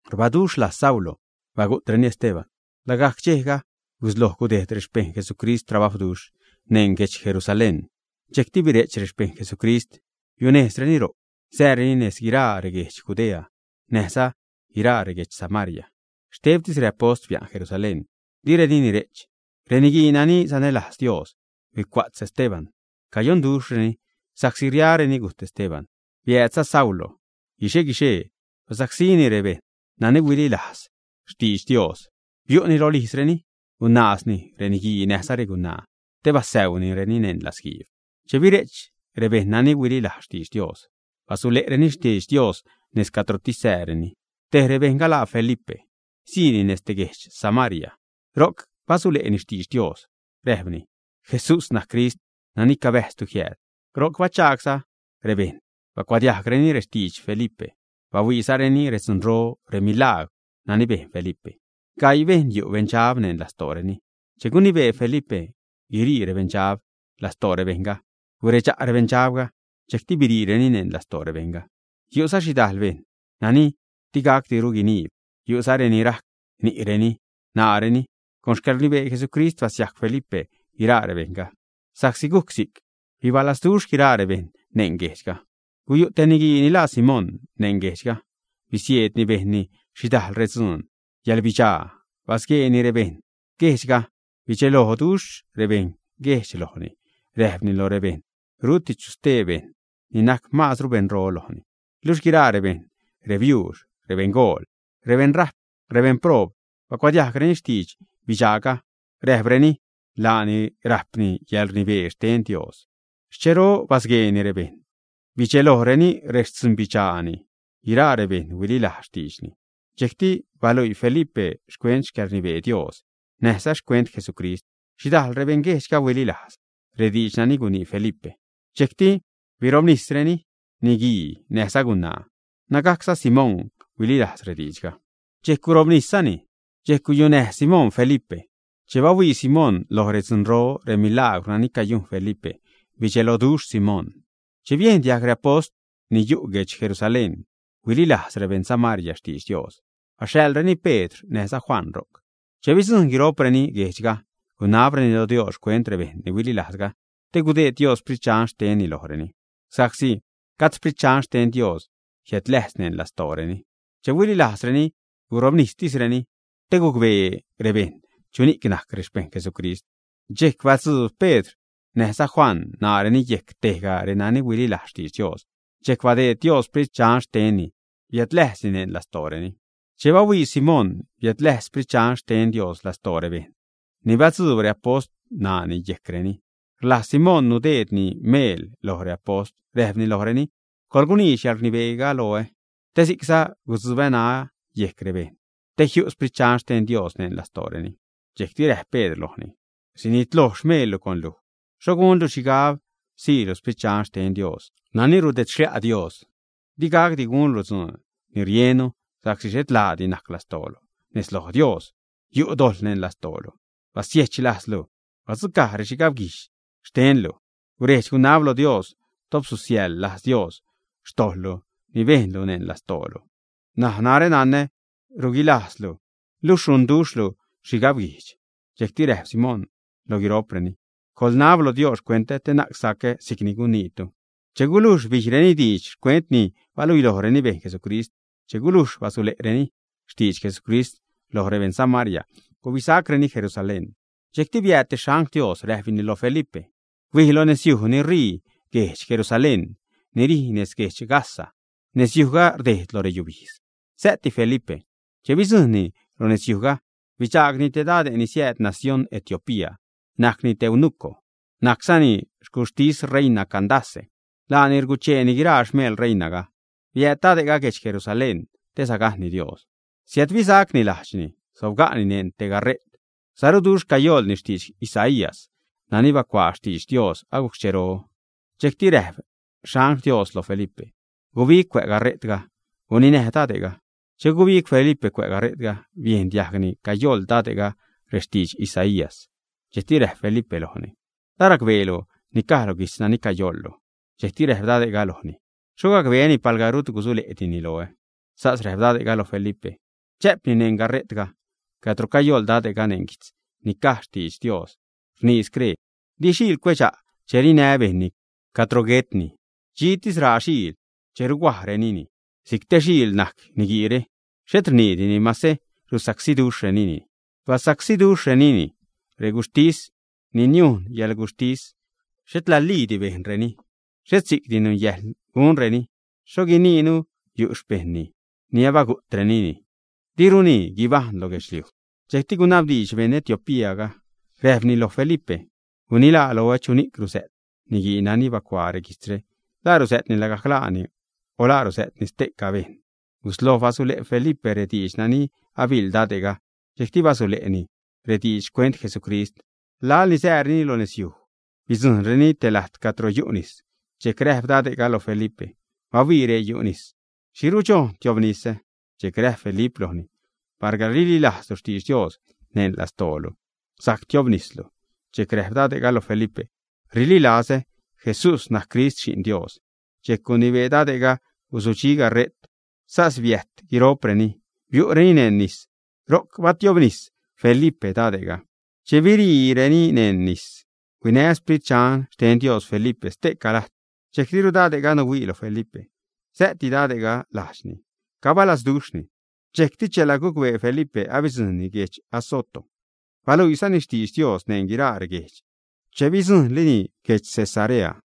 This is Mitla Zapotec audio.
Rbaduxh lajz Saulo bagu'treni Esteban. Lagajc dxejga gusloj gudejd rexpejṉ Jesucrist trabajwduxh neṉ guedx Jerusalén. Dxejcti bire'ch rexpejṉ Jesucrist. Biunejzreni ro'c sääreni nez guiraa reguedx Judea näjza nez guiraa reguedx Samaria. Xtebtis reapost bia'n Jerusalén, direni nire'ch. Reniguii nani sanälajz Dios huicua'tz Esteban. Cayonduxhreni sa'csi riareni gujt Esteban. Biäädza Saulo, guixe-guixee basacsíni rebejṉ nani huililajz xtidx Dios. Biu'ni rolijzreni, gunaazni reniguii näjza regunaa te basäunireni neṉ latzguiib. Che bire'ch rebejṉ nani huililajz xtidx Dios, basule'reni xtidx Dios nez cadrotis sääreni. Tej rebejṉga laa Felipe. Siini nez te guedx Samaria. Ro'c basule'ni xtidx Dios. Räjpni: ―Jesús najc Crist nani cabäjztu jiääd. Ro'c bachagsa' rebejṉ bacuadiajgreni rextidx Felipe, bahuiizareni redzunro, remilagwr nani bejn Felipe. Gaii bejṉ yu' beṉdxab neṉ lastooreni. Che gunibee Felipe guirii rebeṉdxab lastoo rebejṉga, guredxa' rebeṉdxabga, dxejcti biriireni neṉ lastoo rebejṉga. Yu'za xhidajl bejṉ nani digacdiru guiniib, yu'za reni rajc ni'reni, ṉaareni. Con xcäḻrnibee Jesucrist basiajc Felipe guiraa rebejṉga. Sa'csi gujc si'c, bibalazduxh guiraa rebejṉ neṉ guejdxga. Guyu' te niguii ni laa Simón neṉ guejdxga. Bisieedni bejnni xhidajl redzuun yäḻbidxaa, basgueeni rebeṉguejdxga. Bidxeloduxh rebeṉguejdx lojni. Räjpni lo rebejṉ rutru chu stee bejṉ ni najc maazru beṉro lojni. Luxh guiraa rebejṉ, rebiuux, rebeṉgool, rebeṉrajp, rebeṉproob bacuadiajgreni xtidx bidxaaga, räjpreni: ―Laani rajpni yälrnibee xten Dios. Xchero basgueeni rebejṉ, bidxelojreni rextzunyäḻbidxaani. Guiraa rebejṉ huililajz xtiidxni. Dxejcti baluii Felipe xcuent xcäḻrnibee Dios, näjza xcuent Jesucrist. Xhidajl rebeṉguejdxga huililajz rediidx nani gunii Felipe. Dxejcti birobnisreni, niguii näjza gunaa. Nägajcza Simón huililajz rediidxga dxejc gurobniszani. Dxejc guyunäj Simón Felipe. Che bahuii Simón lo redzunro, remilagwr nani cayujn Felipe, bidxeloduxh Simón. Che biejn diajg reapost ni yu' guedx Jerusalén huililajz rebeṉ Samaria xtidx Dios, baxhaḻreni Pedr näjza Juan ro'c. Che bidzujṉ guiro'preni guejdxga, gunabreni lo Dios xcuent rebejṉ ni huililajzga te gudeed Dios Sprit Dxan xtenni lojreni, sa'csi gajd Sprit Dxan xten Dios jiädläjz neṉ lastooreni. Che huililajzreni, gurobnistisreni te gucbee rebejṉ chuni'c najc rexpejṉ Jesucrist. Dxejc batzuub Pedr näjza Juan ṉaareni yejc tejga renani ahuililajz xtidx Dios, dxejc badeed Dios Sprit Dxan xtenni biädläjzni neṉ lastooreni. Che bahuii Simón biädläjz Sprit Dxan xten Dios lastoo rebejṉ ni batzuub reapost ṉaani yejcreni, rlajz Simón nudeedni meel loj reapost, räjpni lojreni: ―Coḻguniidx yäḻrnibee loä te si'cza gudzubä ṉaä yejc rebejṉ, te jiu' Sprit Dxan xten Dios neṉ lastooreni. Dxejcti räjp Pedr lojni: ―¡Sunitloj xmeellu con luj! Xho gunlu xhigab siilu Sprit Dxan xten Dios nani rudedxlia' Dios. Digacdi gunlu dzuun ni riennu, sa'csi xhet laadi najc lastoolu nez loj Dios; yu' dojḻ neṉ lastoolu. Basie'ch lajzlu, badzucaj rexhigab guijdx xtenlu. Guredx-gunab lo Dios, top susiäjḻ lajz Dios xtojḻlu ni bejnlu neṉ lastoolu. N̲aj narä nanä ruguilazduxhlu, luxh runduxhlu xhigabguijdx. Dxejcti räjp Simón lo guiro'preni: ―Coḻnab loj Dios xcuentä te na'c sacä si'cni caniitu. Che gulujxti bijreni diidx xcuent ni bahuilojreni bejn Jesucrist, che gulujx basule'reni xtidx Jesucrist loj rebeṉ Samaria, gubisacreni Jerusalén. Dxejcti biääd te xangl Dios, räjpni lo Felipe: ―Huij lo nezyuj ni ṟii guedx Jerusalén, ni rij nez guedx Gaza. Nezyujga rdejd lo reyubijdz. Sä'ti Felipe. Che bidzujṉni lo nezyujga, bidxaagni te dade' ni siääd nacióṉ Etiopía. Najcni te eunuco, najczani xcuxhtis reina Candace. Laani rgucheeni guiraa xmeel reinaga. Biääd dade'ga guedx Jerusalén te sagajṉni Dios. Siädbisacni lajdxni. Sobga'ni neṉ te gaṟe't saruduxh, cayoḻni xtidx Isaías, nani bacuaa xtidx Dios agujc xchero. Dxejcti räjp angl xten Dios lo Felipe: ―Gubig cuä' gaṟe'tga, guninäj dade'ga. Che gubig Felipe cuä' gaṟe'tga, biejn diajgni cayoḻ dade'ga rextidx Isaías. Dxejcti räjp Felipe lojni: ―¿La racbeelu ni caj lo guijtz nani cayoḻlu, ä? Dxejcti räjp dade'ga lojni: ―¿Xho gacbeäni palga rut gusule'dini loä? Sas räjp dade'ga lo Felipe chä'pni neṉ gaṟe'tga. Cadro cayoḻ dade'ga neṉ guijtz ni caj xtidx Dios rnii scree: Di xiil cuedxa' che rinä bejṉni cadro guetni; dxitis raa xiil che ruhuajrenini. Si'c te xiil najc niguiire, xhet rniidini mase rusacsíduxhrenini. Basacsíduxhrenini. Reguxhtis ni niujn yäḻguxhtisni xhet laliidi bejnreni. Xhet si'cti nunyäjḻ gunreni. ¿Xho guiniinu yu' xpejṉni? Ni abagu'trenini. Diruni guibajṉ lo guedxliuj. Dxejcti gunabdiidx beṉ Etiopía, räjpni lo Felipe: ―Gunilaa loä, chuni'c ruzä't niguii nani bacuaa reguijtzre, ¿la ruzä'tni lagajc laani o la ruzä'tni ste'ca bejṉ, ä? Gusloj basule' Felipe rediidx nani abiḻ dade'ga. Dxejcti basule'ni rediidx xcuent Jesucrist. Laḻ ni sääreni lo nezyuj, bidzujṉreni te lajt cadro yu' nis. Dxejc räjp dade'ga lo Felipe: ―¡Bahuii, ree yu' nis! ¿Xhi rudxojn tiobnisä? Dxejc räjp Felipe lojni: ―Palga rililajzlu xtidx Dios neṉ lastoolu, sajc tiobnislu. Dxejc räjp dade'ga lo Felipe: ―Rililazä Jesús najc Crist Xi'n Dios. Dxejc gunibee dade'ga gusudxi gaṟe't, sas biäjt guiro'preni, biu'reni neṉ nis, ro'c batiobnis Felipe dade'ga. Che biriireni neṉ nis, huinä Sprit Dxan xten Dios Felipe ste'ca lajt. Dxejc diru dade'ga nuhuii lo Felipe. Sä'ti dade'ga lajdxni, cabalazduxhni. Dxejcti chela gucbee Felipe abidzujṉni guedx Azoto. Baluiizani xtidx Dios neṉ guiraa reguejdx che bidzujṉlini guedx Cesarea.